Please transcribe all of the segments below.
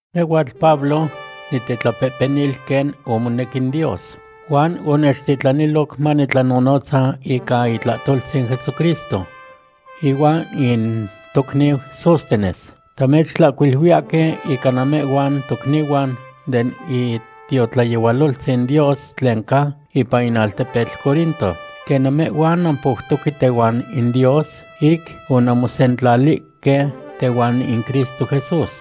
Nehhuatl Pablo, nitetlapehpenil quen omonec in Dios, huan onechtitlaniloc manitlanonotza ica itlahtoltzin Jesucristo. Ihuan in tocniu Sóstenes, tamechtlahcuiluiyahque ica namehhuan tocnihuan den itiotlayehualoltzin Dios tlen ca ipan in altepetl Corinto, quen namehhuan nampoutoque tehuan in Dios, ic onanmosetilihque tehuan in Cristo Jesús.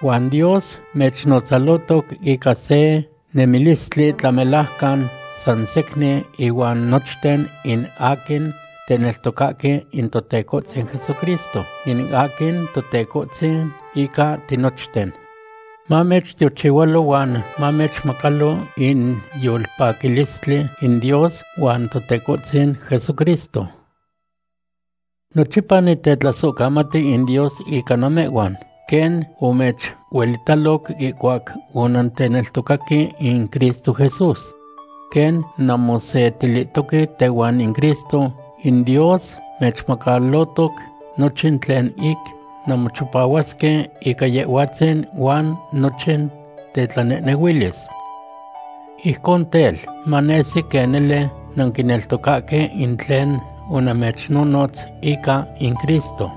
Huan Dios mechnotzalotoc ica se nemilistli tlamelajcan san secnin inuan nochten in aquin teneltocahque in Totecohtzin Jesucristo, in aquin Totecohtzin ica tinochten. Mamechtiochihualo huan mamechmacalo in yolpaquilistli in Dios huan Totecohtzin Jesucristo. Nochipa nitetlasohcamati in Dios ica namehhuan, quen omechuelitaloc ihcuac onanteneltocaque in Cristo Jesús. Quen nanmosetilihtoque tehuan in Cristo, in Dios mechmacalotoc nochin tlen ic nanmochipahuasque ica Yehhuatzin huan nochin tetlanehnehuilis. Ijcon tel, manesi quen nele nanquineltocahque in tlen onamechnonotz ica in Cristo.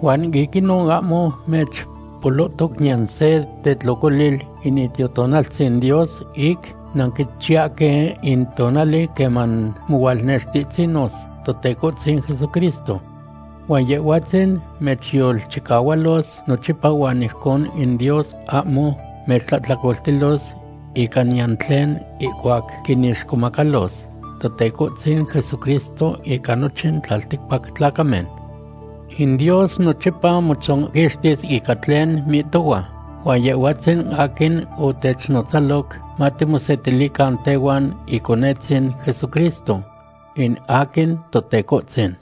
Huan ic inon ahmo mechpolohtoc niyan se tetlocolil in Itiotonaltzin Dios ic nanquichiyahque in tonali queman mohualnextihtzinos Totecohtzin Jesucristo. Huan Yehhuatzin mechyolchicahualos nochipa huan ijcon in Dios ahmo mechtlahtlacoltilos ica niyan tlen ihcuac quinixcomacalos Totecohtzin Jesucristo ica nochin tlalticpac tlacamen. In Dios nochipa motzonquixtis ica tlen mihtohua, huan Yehhuatzin aquin otechnotzaloc matimosetilican tehuan Iconetzin Jesucristo, in aquin Totecohtzin.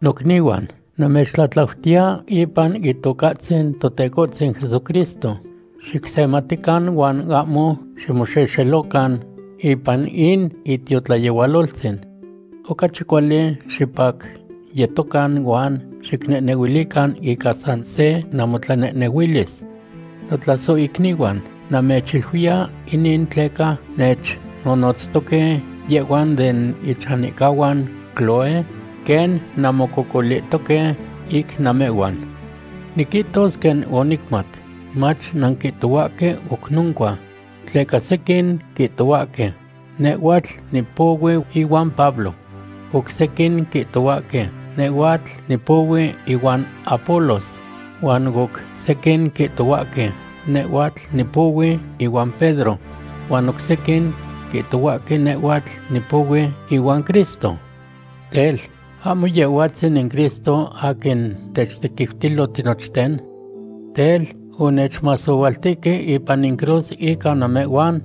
Nocnihuan, namechtlatlautiya ipan Itocahtzin Totecohtzin Jesucristo, xicsematican huan ahmo ximoxexelocan ipan in itiotlayehualoltzin. Ocachi cuali, xipacyetocan huan xicnehnehuilican ica san se namotlanehnehuilis. Notlasohicnihuan, namechiluiya inin tleca nechnonotztoque yehhuan den ichanihcahuan Cloé quen nanmococolihtoque ic namehhuan. Niquihtos quen onicmat, mach nanquihtohuahque oc noncua. Tleca sequin quihtohuahque: “Nehhuatl nipohui ihuan Pablo.” Oc sequin quihtohuahque: “Nehhuatl nipohui ihuan Apolos.” Huan oc sequin quihtohuahque: “Nehhuatl nipohui ihuan Pedro.” Huan oc sequin quihtohuahque: “Nehhuatl nipohui ihuan Cristo.” Tel, ¿ahmo Yehhuatzin in Cristo aquin techtequiutilo tinochten? Tel, ¿onechmasohualtihque ipan in cruz ica namehhuan?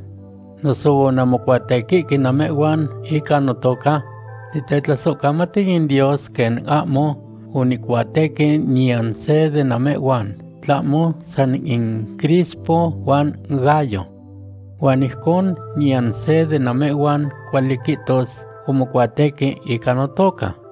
¿Noso onanmocuatequihque namehhuan ica notoca? Nitetlasohcamati in Dios quen ahmo onicuatequi niyan se de namehhuan, tlahmo san in Crispo huan Gayo. Huan ijcon niyan se de namehhuan cuali quihtos omocuatequi ica notoca.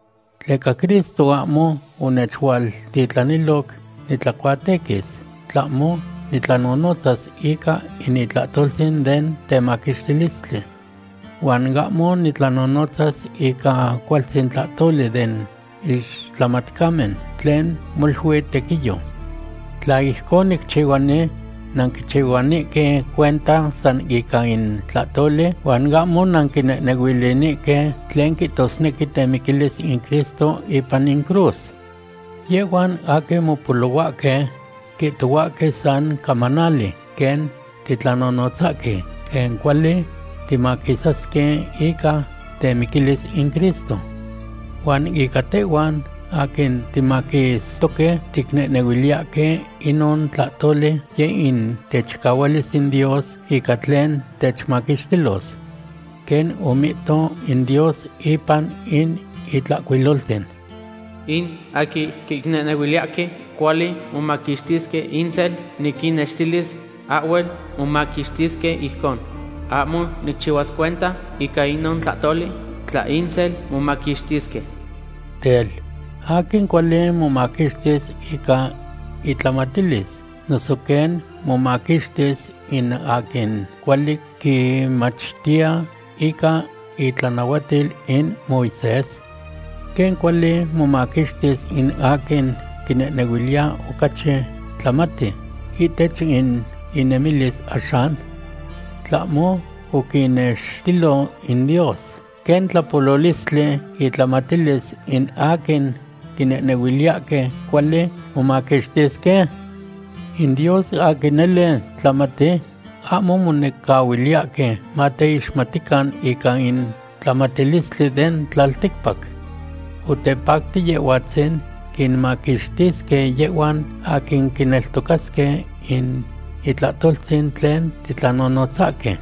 Tleca Cristo ahmo onechualtitlaniloc nitlacuatequis, tlahmo nitlanonotzas ica in itlahtoltzin den temaquixtilistli. Huan ahmo nitlanonotza ica cualtzin tlahtoli den ixtlamatcamen tlen molui tequiyo. Tla ijcon nicchihuani, nanquichihuanihque cuenta san ica in tlahtoli huan ahmo nanquinehnehuilinihque tlen quihtosnequi temiquilis in Cristo ipan in cruz. Yehhuan aquin mopolohuahque quihtohuahque san camanali quen titlanonotzahque quen cuali timaquisasque ica temiquilis in Cristo. Huan ica tehhuan aquin timaquistoque, ticnehnehuiliyahque inon tlahtoli yeh in techicahualis in Dios ica tlen techmaquixtilos. Quen omihto in Dios ipan in Itlahcuiloltzin: In aquin quinehnehuiliyahque cuali momaquixtisque insel, niquinnextilis ahhuel momaquixtisque ijcon. Ahmo nicchihuas cuenta ica inon tlahtoli tla insel momaquixtisque. Tel, ¿aquin cuali momaquixtis ica itlamatilis noso quen momaquixtis in aquin cuali quimachtiya ica itlanahuatil in Moisés? ¿Quen cuali momaquixtis in aquin quinehnehuiliya ocachi tlamati ihtech in inemilis axan? ¿Tlahmo oquinextilo in Dios quen tlapololistli intlamatilis in aquin quinehnehuiliyahque cuali momaquixtisque? In Dios aquin nele tlamati, ahmo monecahuiliyahque mateixmatican ica in tlamatilistli den tlalticpac. Otepacti Yehhuatzin quinmaquixtisque yehhuan aquin quineltocasque in itlahtoltzin tlen titlanonotzahque.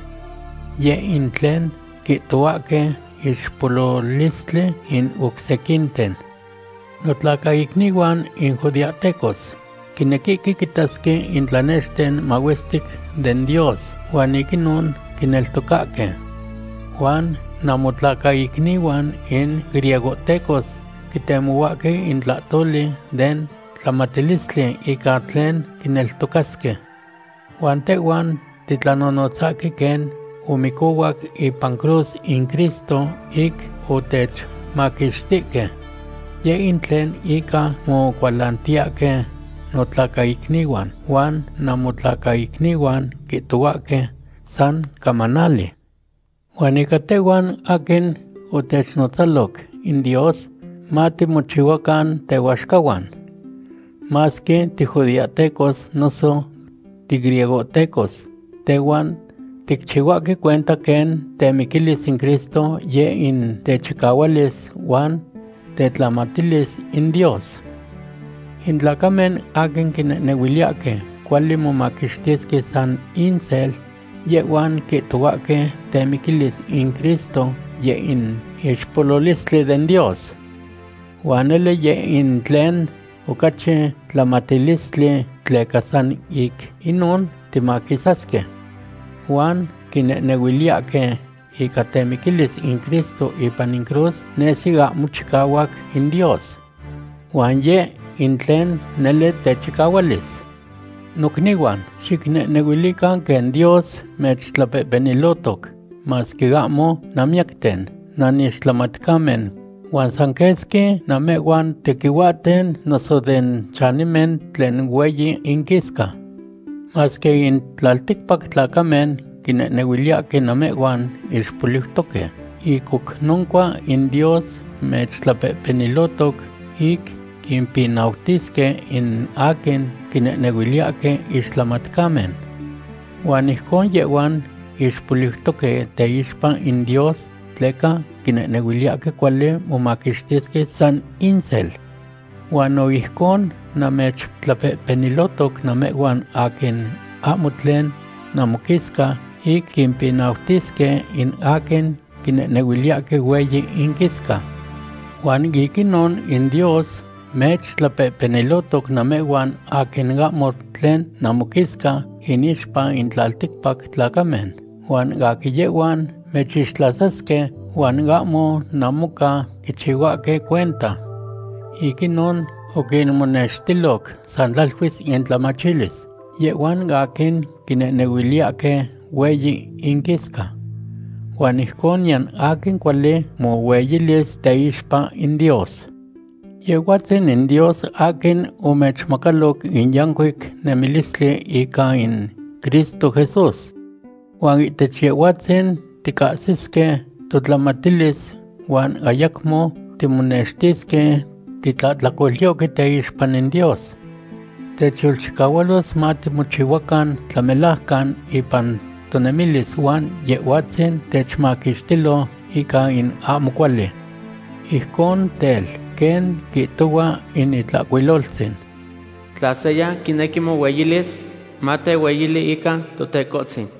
Yeh in tlen quihtohuahque ixpololistli in oc sequinten. Notlacaicnihuan in judeahtecos quinequihque quitasque in tlanexten mahuestic den Dios, huan ic inon quineltocasque. Huan namotlacaicnihuan in griegohtecos quitemohuahque in tlahtoli den tlamatilistli ica tlen quineltocasque. Huan tehhuan titlanonotzahque quen omicohuac ipan cruz in Cristo ic otechmaquixtihque. Yeh in tlen ica mocualantiyahque notlacaicnihuan, huan namotlacaicnihuan quihtohuahque san camanali. Huan ica tehhuan aquin otechnotzaloc in Dios, matimochihuacan tehuaxcahuan, masque tijudeahtecos noso tigriegohtecos, tehhuan ticchihuahque cuenta quen temiquilis in Cristo yeh in techicahualis huan tetlamatilis in Dios. In tlacamen aquin quinehnehuiliyahque cuali momaquixtisque san insel, yehhuan quihtohuahque temiquilis in Cristo yeh in ixpololistli den Dios. Huan nele yeh in tlen ocachi tlamatilistli tleca san ic inon timaquisasque. Huan quinehnehuiliyahque ica temiquilis in Cristo ipan in cruz nesi ahmo chicahuac in Dios. Huan yeh in tlen nele techicahualis. Nocnihuan, xicnehnehuilican quen Dios mechtlapehpenilohtoc, masque ahmo nanmiyacten nanixtlamatcamen, huan san quesqui namehhuan tequihuahten noso den chanimen tlen hueyi inquisca. Masque in tlalticpac tlacamen quinehnehuiliyahque namehhuan ixpoliutoque, ic oc noncua in Dios mechtlapehpenilohtoc ic quimpinautisque in aquin quinehnehuiliyahque ixtlamatcamen. Huan ijcon yehhuan ixpoliutoque teixpa in Dios tleca quinehnehuiliyahque cuali momaquixtisque san insel. Huan no ijcon mechtlapehpenilohtoc namehhuan aquin ahmo tlen namoquisca ic quimpinautisque in aquin quinehnehuiliyahque hueyi inquisca. Huan ic inon in Dios mechtlapehpenilohtoc namehhuan aquin ahmo tlen namoquisca inixpa in tlalticpac tlacamen, huan aquin yehhuan mechixtlasasque huan ahmo namoca quichihuahque cuenta. Ic inon oquinmonextiloc san tlaluis intlamachilis yehhuan aquin quinehnehuiliyahque hueyi inquisca. Huan ijcon niyan aquin cuali mohueyilis teixpa in Dios. Yehhuatzin in Dios aquin omechmacaloc in yancuic nemilistli ica in Cristo Jesús. Huan ihtech Yehhuatzin ticahsisque totlamatilis huan ayacmo timonextisque titlahtlacolyohque teixpa in Dios. Techyolchicahualos matimochihuacan tlamelajcan ipan tonemilis huan Yehhuatzin techmaquixtilo ica in ahmo cuali. Ijcon tel, quen quihtohua in Itlahcuiloltzin: “Tla seya quinequi mohueyilis, matehueyili ica Totecohtzin.”